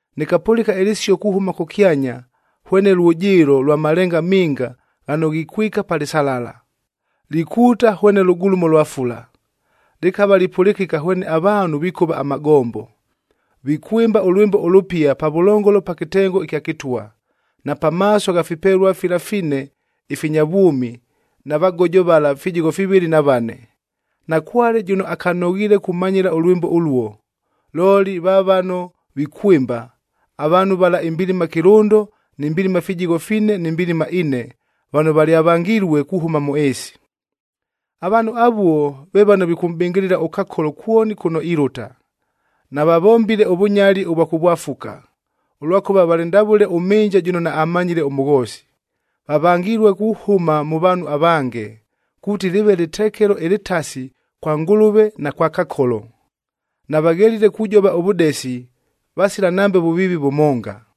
Nɨkapʉlɨka ɨlɨsio kuhʉma kʉkyanya hwene lwʉjɨɨlo lwa malenga minga ghano ghikwika pa lɨsalala, likuuta hwene lʉgulumo lwa fula. Lɨkava lipʉlɨkɨka hwene avaanhu vikʉva amagombo, vikwɨmba ʉlwɨmbo ʉlʉpia pavʉlongolo pa kɨtengo ɨkya kɨtwa, na pamaaso gha fipelua fila fine ifinya vwʉmi na vagojo vala fijigho fivɨlɨ na vane. Nakwale jʉno akanoghiile kumanyɨla ʉlwɨmbo ʉluo, looli va vano vikwɨmba, avaanhu vala imbilima kɨlʉndo ni mbilima fijigho fine ni mbilima ine vano valyavangilue kuhʉma mʉ ɨɨsi. Avaanhu avuo ve vano vikʉmʼbɨngɨlɨla ʉKakolo kwoni kʉno ilʉta. Navavombile ʉvʉnyali ʉvwa kʉvwafuka, ʉlwakʉva valɨ ndavʉle ʉmhɨnja jʉno naammanyile ʉmʉghoosi. Vavangilue kuhʉma mʉ vaanhu avange, kuuti lɨɨve lɨtekelo ɨlɨtasi kwa Ngʉlʉve na kwa Kakolo. Navaghelile kujova ʉvʉdesi, vasila nambe vʉviivi vʉmonga.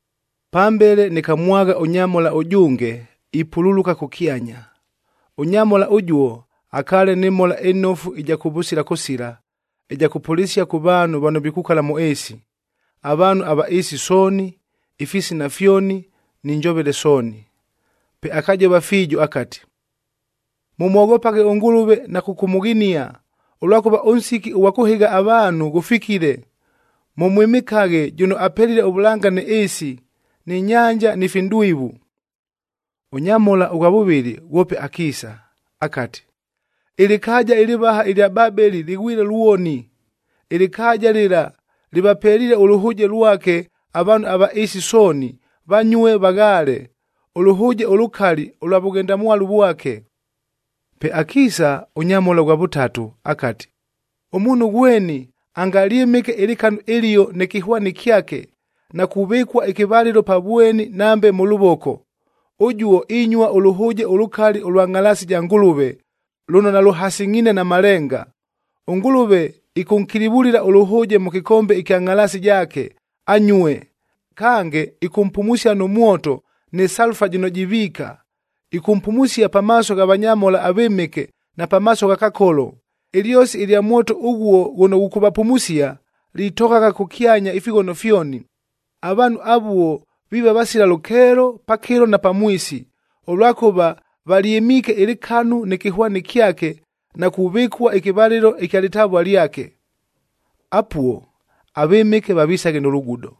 Pambele nɨkamwagha ʉnyamhola ʉjʉnge ipululuka kʉkyanya. Ʉnyamhola ʉjuo akaale nɨ Mhola ɨNofu ɨja kʉvʉsila kʉsila ɨja kʉpʉlɨsia kʉ vaanhu vano vikukala mʉ ɨɨsi: avaanhu ava ɨɨsi sooni, ifisina fyoni, ni njovele sooni. Pe akajova fiijo akati, “Mʉmwoghopaghe ʉNgʉlʉve na kʉkʉmʉghinia, ʉlwakʉva ʉnsiki ʉghwa kʉhɨgha avaanhu ghʉfikile. Mʉmwɨmɨkaghe jʉno apelile ʉvʉlanga nɨ ɨɨsi, nɨ nyanja, ni finʼdwivu.” Ʉnyamhola ʉghwa vʉvɨlɨ ghwope akiisa akati, “Ɨlɨkaaja ɨlɨvaha ɨlya Babeli lɨghwile lwoni! Ɨlɨkaaja lɨla lɨvapeliile ʉlʉhʉʉjea lwake avaanhu ava ɨɨsi sooni vanyue vaghaale, ʉlʉhʉʉje ʉlʉkali ʉlwa vʉghendamwalu vwake.” Pe akiisa ʉnyamhola ʉghwa vʉtatu akati, “Ʉmuunhu ghweni angalyɨmɨke ɨlɨkanu ɨlio nɨ kɨhwani kyake, na kuvɨkua ɨkɨvalɨlo pa vweni nambe mʉ lʉvoko, ʉjuo inyua ʉlʉhʉʉje ʉlʉkali ʉlwa ngʼhalaasi ja Ngʉlʉve lʉno nalʉhasɨngʼhiine na malenga. ɄNgʉlʉve ɨkʉnkilivulila ʉlʉhʉʉje mʉ kɨkombe ɨkya ngʼhalaasi jaake, anyue. Kange, ɨkʉmpumusia nʉ mwoto nɨ salufa jɨno jiviika. Ɨkʉmpumusia pamaaso gha vanyamhola avɨmɨke na pamaaso gha Kakolo. Ɨlyosi ɨlya mwoto ʉghuo ghʉno ghʉkʉvapumusia, litoghagha kʉkyanya ifighono fyoni. Avaanhu avuo viiva vasila lʉkeelo pakɨlo na pamwisi, ʉlwakʉva valyɨmiike ɨlɨkanu nɨ kɨhwani kyake na kuvɨkua ɨkɨvalɨlo ɨkya lɨtavua lyake.” Apuo avɨmɨke vavisaghe nʉ lugudo,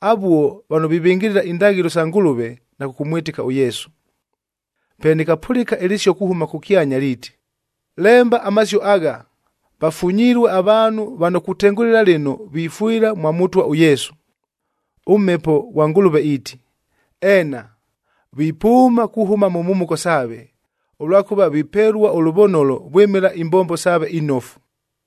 avuo vano vivɨngɨlɨla indaghɨlo sa Ngʉlʉve na kʉkʉmwɨtɨka ʉYesu. Pe nɨkapʉlɨka ɨlɨsio kuhʉma kʉkyanya liiti, “Lemba amasio agha: Vafunyilue avaanhu vano kutengʉlɨla lɨno vifwɨla mwa Mʉtwa ʉYesu.” ɄMhepo ghwa Ngʉlʉve iiti, “Eena, vipʉʉma kuhʉma mʉ mhumuko saave, ʉlwakʉva vipelua ʉlʉvonolo vwɨmɨla imbombo saave inofu.”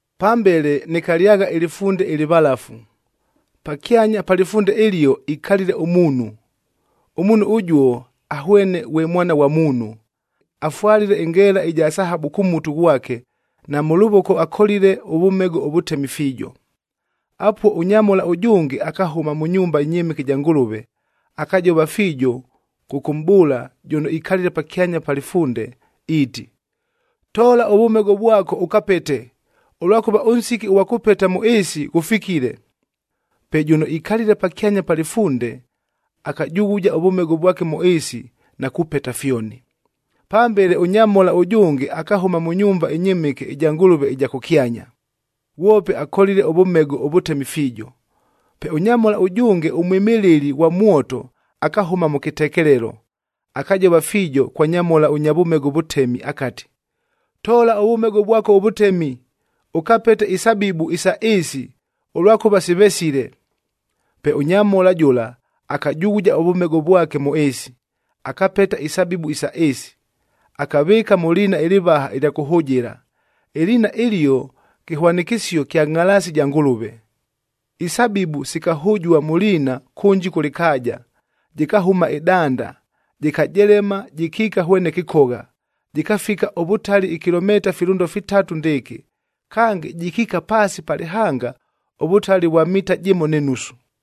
Pambele nɨkalyagha ɨlɨfunde ɨlɨvalafu, pakyanya pa lɨfunde ɨlio ikalile ʉmuunhu. Ʉmuunhu ʉjuo ahwene ghwe Mwana ghwa Muunhu,b afwalile ɨngeela ɨja sahabu kʉ mutu ghwake na mʉ lʉvoko akolile ʉvʉmego ʉvʉtemi fiijo. Apuo ʉnyamhola ʉjʉnge akahʉma mʉ nyumba ɨnyɨmɨke ɨja Ngʉlʉve, akajova fiijo kʉkʉmʼbʉʉla jʉno ikalile pakyanya pa lɨfunde iiti, “Toola ʉvʉmego vwako ʉkapete, ʉlwakʉva ʉnsiki ʉghwa kʉpeta mʉ ɨɨsi ghʉfikile.” Pe jʉno ikalile pakyanya pa lɨfunde akajughuja ʉvʉmego vwake mʉ ɨɨsi na kupeta fyoni. Pambele ʉnyamhola ʉjʉnge akahʉma mʉ nyumba ɨnyɨmɨke ɨja Ngʉlʉve ɨja kʉkyanya. Ghwope akolile ʉvʉmego ʉvʉtemi fiijo. Pe ʉnyamhola ʉjʉnge ʉmwɨmɨlɨli ghwa mwoto akahʉma mʉ kɨtekelelo. Akajova fiijo kwa nyamhola ʉnya vʉmego ʉvʉtemi akati, “Toola ʉvʉmego vwako ʉvʉtemi, ʉkapete isabibu isa ɨɨsi, ʉlwakʉva sivesile.” Pe ʉnyamhola jʉla akajughuja ʉvʉmego vwake mʉ ɨɨsi, akapeta isabibu isa ɨɨsi, akavɨɨka mʉ liina ɨlɨvaha ɨlya kʉhʉjɨla,c ɨliina ɨlio kɨhwanɨkɨsio kya ngʼhalaasi ja Ngʉlʉve. Isabibu sikahʉjua mʉ liina kʉnji kʉ lɨkaaja. Jɨkahʉma ɨdanda, jɨkajelema jɨkiika hwene kɨkogha, jɨkafika ʉvʉtali ikilomita filʉndo fitatu ndɨɨkɨ, kange jɨkiika paasi pa lɨhanga ʉvʉtali ʉvwa mita jɨmo nɨ nusu.